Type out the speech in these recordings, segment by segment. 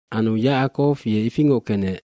aAnu Yacakow ye ifingoc kenec.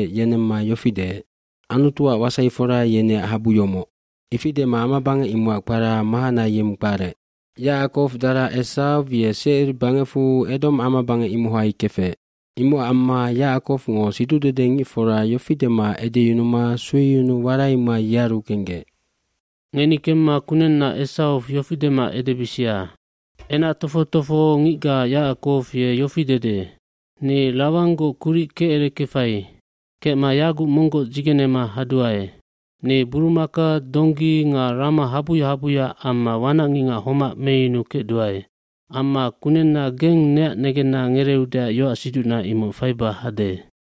yenemma yofi deec, “Anutuac wasaifora yeneac habu yomoc.” Ifi dema amabangec imocac kpara Mahanayimb kparec. Yacakow ye dara Esaw Secir bangecfu Edom amabangec imohai kefec. Imocac amma Yacakowngo siducdedengicfora yofi dema edeyunuma sueyunuu waraima yearu kenggec. “Ngeni kemma kunenna Esaw yofi dema edebisia, ‘Enac tofoc tofohongicga Yacakow ye yofi dede.’ ‘Ni Lawanggoc kuric kecerekefai. Kecma yaguc monggoc dzigenema haduae. cNi burumaka, donggi nga rama habuya habuya amma wanacngicngac homac meyunukecduae. Amma kunenna geng neac negenna ngereeudeac yoacsiducna imoc faiba hade.’”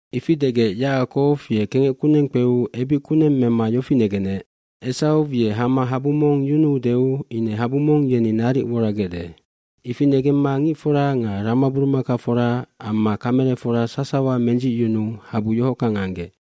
Ifi degec Yacakow ye kengec kuneng kpeu ebic kuneng mema yofi negenec, “Esaw ye hama habu mong yunuudeu ine habu mong yeni naric woragecde.” Ifi negemma ngicfora nga ramaburumakafora amma kamelefora sasawa mendzicyunuu habu yohockang anggec.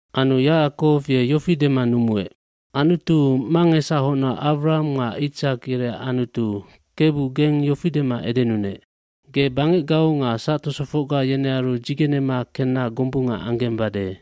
dAnu Yacakow ye yofi dema numuec, “Anutu, mangesahocna Awraham nga Itsak yereac Anutu, Kebu geng yofi dema edenunec. Ge bangecgau nga sactosofocga yenearu dzigenema kenna gombunga anggembade.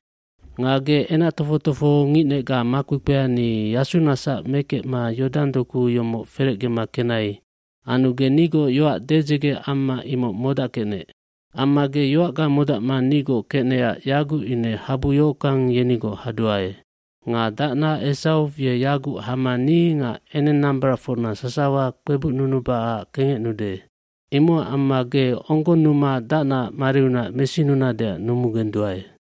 eNga ge enac tofoc tofohongicnecga makpekpea, ni yasunasac mekecma Yodang doku yomoc ferecge kenai anu ge nigoc yoac dedzege amma imoc modackecnec. Amma ge yoacga modacma nigoc kecnecac yaguc ine habu yohockang yenigoc haduae. Nga dacna Esaw ye yaguc hama ni nga enengnambaracfocna sasawa kpebucnunubacac kengecnude. Imocac amma ge onggonnuma dacnaac mariunac mesinunadeac numugenduae.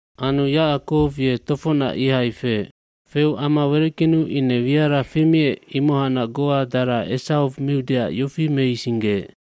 Anu Yacakow ye tofocnac ihai feec. Feu ama wereckenu ine wiara femiec imohacnac goa dara Esaw miudeac yofi meisinggeec,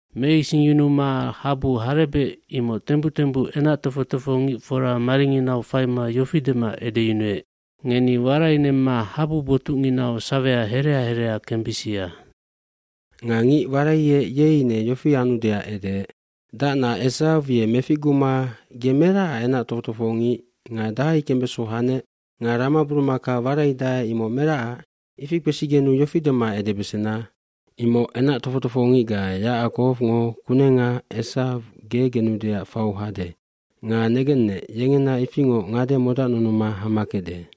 Meisinggema habu harebec imoc tembuc tembuc enac tofoc tofohongicfora maringinau faima yofi dema edeyunuec, “Ngeni warainemma habu botucnginau sawea herea herea kembisia.” Nga ngic waraiec ye ine yofi anudeac edeec, “Dacna Esaw ye meficguma ge meracac enac tofoc tofohongic nga dahai kembeso hanec nga ramaburumaka waraidae imoc meracac?” Ifi kpesigenu yofi dema edebesena, “Imoc enac tofoc tofohongicga Yacakowngo kunenga Esaw ge genudeac fau hade nga negennec yengena ifingoc ngade modacnunuma hama kecde.”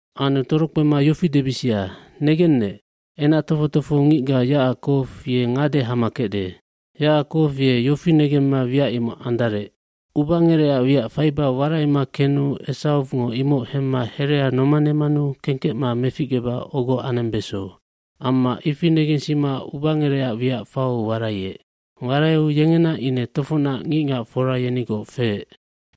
Anu torokpema yofi debisia, ‘Negennec, enac tofoc tofohongicga Yacakow ye ngade hama kecde.’” Yacakow ye yofi negemma wiac imoc andarec, “Ubangerecac wiac faiba waraima kenu Esawngo imoc hemma herea nomanemanu kengkecma meficgeba ogo anembeso.” Amma ifi negensima ubangerecac wiac fau waraiec. Waraiu yengena ine tofocnac ngicngacfora yenigoc feec.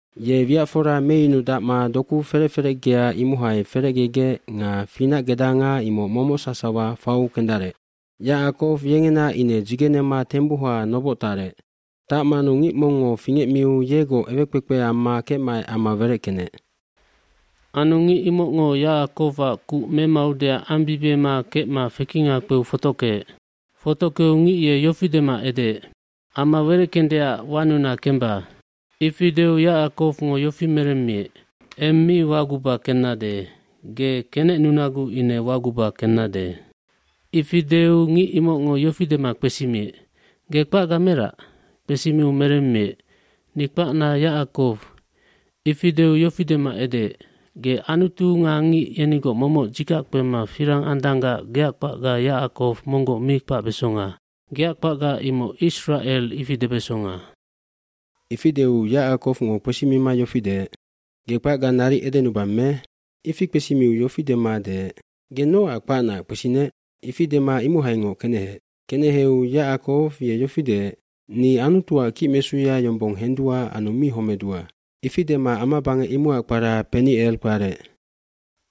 Ye wiacfora meyunudacma doku ferec ferecgea imohai ferecgegec nga finacgedanga imoc momoc sasawa fau kendarec. gYacakow yengena ine dzigenema tembuha noboc tarec. Tacmanu ngic mongngo fingecmiu yegoc ewekpekpe amma kecmaec ama wereckenec. Anu ngic imocngo Yacakowac kuc memaudeac ambibiema kecma fekinga kpeu fotockeec. Fotockeu ngic ye yofi dema edeec, “Ama wereckendeac wanuna kemba.” Ifi deu Yacakowngo yofi meremmiec, “Eng mi waguba kennade, ge kenecnunaguc ine waguba kennade.” Ifi deu ngic imocngo yofi dema kpesimiec, “Ge kpacga merac?” Kpesimiu meremmiec, “Ni kpacna Yacakow.” iIfi deu yofi dema edeec, “Ge Anutu nga ngic yenigoc momoc dzikac kpema firang andanggac geac kpacga Yacakow monggoc mi kpacbesonga. Geac kpacga imoc Isracelh ifi debesonga.” jIfi deu Yacakowngo kpesimima yofi deec, “Ge kpacga naric edenubang me?” Ifi kpesimiu ye yofi deec, “Ge nocac kpacnaac kpesinec?” Ifi dema imohaingoc keneheec. lKeneheu Yacakow ye yofi deec, “Ni Anutuac kicmesuya yombong hendua anu mi homedua.” Ifi dema amabangec imocac kpara Penicelk kparec.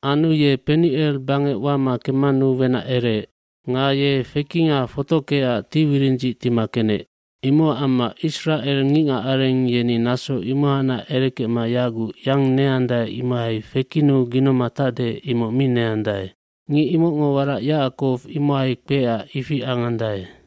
Anu ye Penicel bangec wama kemmanu wenac ereec. Nga ye fekinga fotockeecac tiwirindzic tima kenec. Imocac amma Isracel ngicngacareng yeni naso imohacnac erekecma yaguc yang neandae imohai fekinnu ginoma tacde imoc mi neandae. Ngic imocngo warac Yacakow imohai kpeecac ifi angandae.